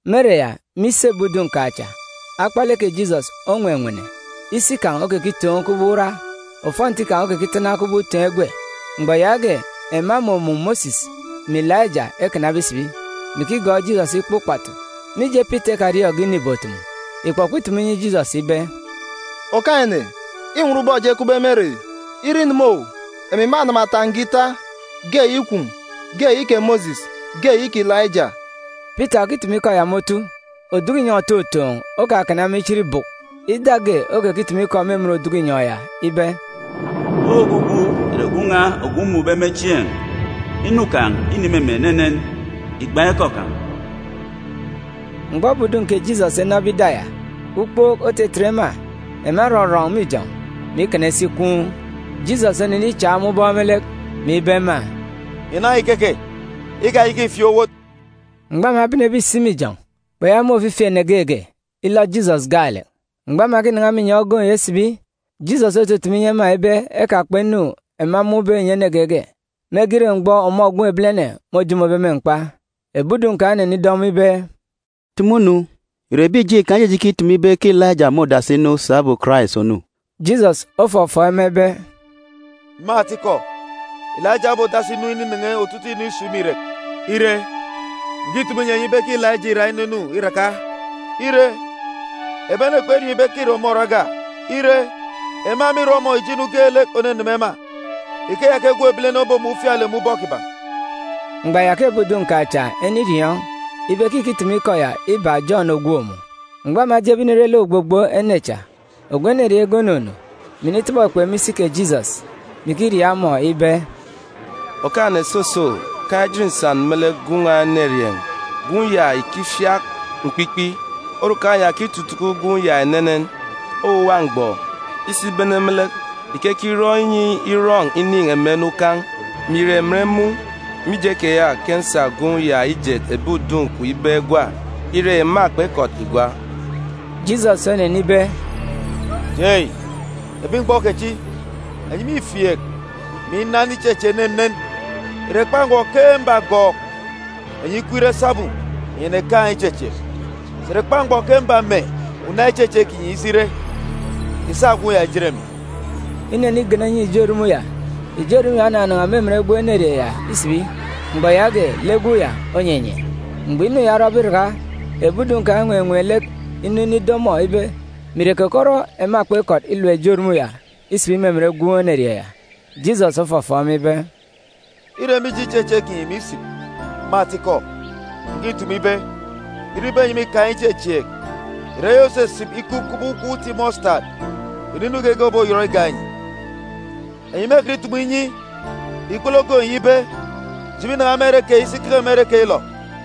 Me ere ya, me isi ebi udun̄ kan̄ cha, akpalek kè Jisọs onwenwene. Isi kan̄ okekitoon̄ kubọk ura, ofọnti kan̄ okekitana kubọk utoon̄ egwe. Mgbọ yaage, ema emumun̄ Mosis mè Ilaija ekanabe isibi, mè ikigọọk Jisọs ikpa ukpatu. Mije Pita ikariọọn̄ge inu ìbotumu, ikpọkpọ itumu inyi Jisọs ibe, “Okaan̄-ene, înwọn ubọk eji ekupbe me ere yi. Ire ineme owu, emi mânama uwu ọfọ ita, ge eyi kwun̄, ge eyi kè Mosis, ge eyi kè Ilaija.” Pita òkitumu ikọ ya me otu, oduku inyọn̄ òtotoon̄ òkakana ema ichit bùk. Ida ge okekitumu ikọ me emen oduku inyọn̄ ya ibe, “Ogwugwu ìre Gwun̄ n̄a ogwu mmun̄be me chieen̄, inu kan̄ îneme emi enenen. Ìgban̄ ikọ kan̄!” Mgbọ ebi udun̄ kè Jisọs enọbe ida ya, ukpook otetet ema, ema erọrọn̄ me ijọn̄, mè ikana isi ichit. Jisọs onenichak ema ubọk me lek, mè ibe ema, “Ìnan̄a ìkeke, ikayaka ìfieek owot.” Mgbọ ema ebenebe isi me ijọn̄, kpeyaka imun̄ ofifi ene geege, ilọ Jisọs gaalek. Mgbọ ema ekinan̄a me inyọn̄ ogoon̄ ya isibi, Jisọs otutumu inyi ema ibe ekakpa inu ema emun̄be ìnyi ene geege, mege ire mgbọ ọmọ Gwun̄ Ebilene môjomobe me mkpa. Ebi udun̄ kan̄ enenido ọmọ ibe, “Tumu-nu, ìre ebi ìjeen̄ Ikan ejeje ikitumu ibe ke Ilaija môdasi inu sabum Karais ònu?” Jisọs ofọfọọk ema ibe, “Me atikọ, Ilaija obodasi inu ininen̄e otutuuk inu isun̄ me irek. Ire, ǹkitumu inyi enyi ibe ke Ilaija îra inunu iraka, ire, ebi ene kperiọọn̄ ibe ke îre ọmọ ore ogwa. Ire, ema mîrọ ọmọ ijo inu geelek òneneme ema. Ikeya ke Gwun̄ Ebilene obomun̄ ufialek me ubọk kiban̄.” Mgbọ ya ke ebi udun̄ kan̄ cha eniriọọn̄ ibe ke ìkitumu ikọ ya ibak Jọn ògwook mun̄. Mgbọ ema ejebe inire lek ogbogbo ene cha, ogwu enerieen̄ ge onunu, mè initọbọ ekpe me isi kè Jisọs, mè ikiriaak ọmọ ibe, “Okaan̄-ene, soso, kaan̄ ejit nsan me lek gwun̄ n̄a enerieen̄. Gwun̄ ya ìkifiak mkpikpi, orukan̄ ya òkitutuku gwun̄ ya enenen. Owuwa mgbọ, isibene me lek, ìkekirọ inyi irọn̄ inin̄ emen ukan̄, mè ìre emen mun̄. Mije keya, ke nsa gwun̄ ya ijet ebi udun̄ kwun̄ ibe egwa, ire, ema kpekọt igwa.” Jisọs onenibe, “Jei, ebi mgbọ kechi, enyi mîfieek, mè inan ichechieek enenen! Ìre kpa mgbọ ke mbagọọk enyi ikup ire sabum enyi ènekaan̄ ichechieek? Sà ìre kpa mgbọ ke mbame una ichechieek kinyi isi ire? Ìsa gwun̄ ya ìjet emi.” Inenigana inyi ijo erumun̄ ya, ijo erumun̄ ya onanan̄a me emen gwun̄ enerieen̄ ya isibi. Mgbọ yaage, lek gwun̄ ya onyenye. Mgbọ inu ya orọbe iraka, ebi udun̄ kan̄ enwenween̄ lek inu inido ọmọ ibe mè ire keke orọ ema kpekọt ilap ijo erumun̄ ya isibi me emen gwun̄ enerieen̄ ya? Jisọs ofọfọọk ema ibe, “Îre mije ichechieek kinyi misip. Me atikọ, ǹkitumu ibe, ire ibe enyi mîkaan̄ ichechieek, ìrere eyi òsisip ikup kubọk ukwuuk uti mọsitadi, kpunu inu geege òboyọt igak enyi. Enyi mêkọt itumu inyi ikpele ogoon̄ yi ibe, ‘Jibi nan̄a me ere keyi si keke me ere keyilọ!’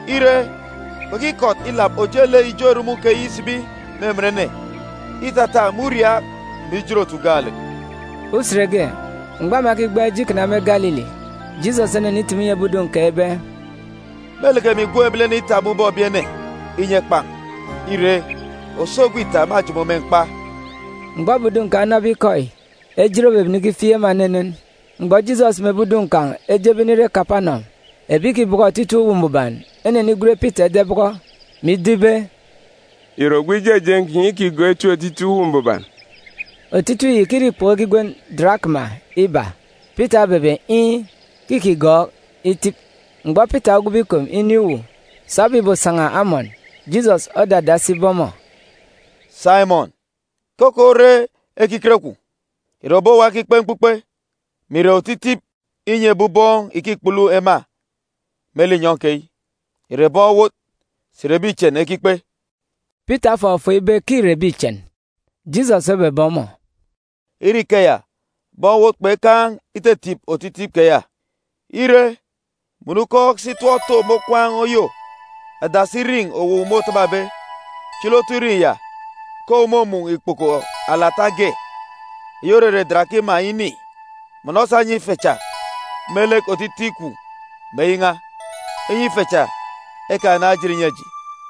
Ire, kpekikọt ilap ojelek ijo erumun̄ keyi isibi me emen ene, îtata me uriaak mè ijin-otu gaalek.”] Usen ge, mgbọ ema ekigbaan̄ ije ikana me Galili, Jisọs onenitumu inyi ebi udun̄ kan̄ ibe, “Mêleke emi Gwun̄ Ebilene itap me ubọk ebi ene, inyi ekpan̄. Ire, òso egwe ita, mâjomo me mkpa.” Mgbọ ebi udun̄ kan̄ enọbe ikọ yi, ejit obebene ikifieek ema enenen. Mgbọ Jisọs mè ebi udun̄ kan̄ ejebe inire Kapanọm, ebi ìkibọkọ otitip uwu Mbuban enenigwen Pita ida ibọkọ, mè ido ibe, “Ìre ogwu ijejeen̄ kinyi îkigọọk itip otitip Uwu Mbuban?” Otitip yi ìkire ikpoko ekigwen darakima iba. Pita obebe iin̄, ke îkigọọk itip. Mgbọ Pita ogwube ikom inin̄ uwu, sabum ìbosan̄a amọn, Jisọs odadasi ibe ọmọ, “Saimọn, keke ore ekiket kwun̄? Ìre ebi owa ekikpe mkpukpe, mè ìre otitip inyi ebi ubọọn̄ ìkikpulu ema me linyọn̄ keyi? Ìre bọn owot, sà ìre ebi ichen ekikpe?” Pita ofọfọọk ibe ke îre ebi ichen. Jisọs obebe ọmọ, “Ire ikeya, bọn owot kpekaan̄ ititip otitip keya! Ire, mọnọ ukọọk si tọp to me okwaan̄ oyô, adasi irin̄ owu môtababe, chili otu irin̄ ya, ke owu mômun̄ ikpoko alata ge eyi òrere darakima ini. Mọnọ sa nyi ife cha me lek otitip kwun̄ mè eyi n̄a, inyi ife cha ekanaan̄ ejit ìnyi eji.”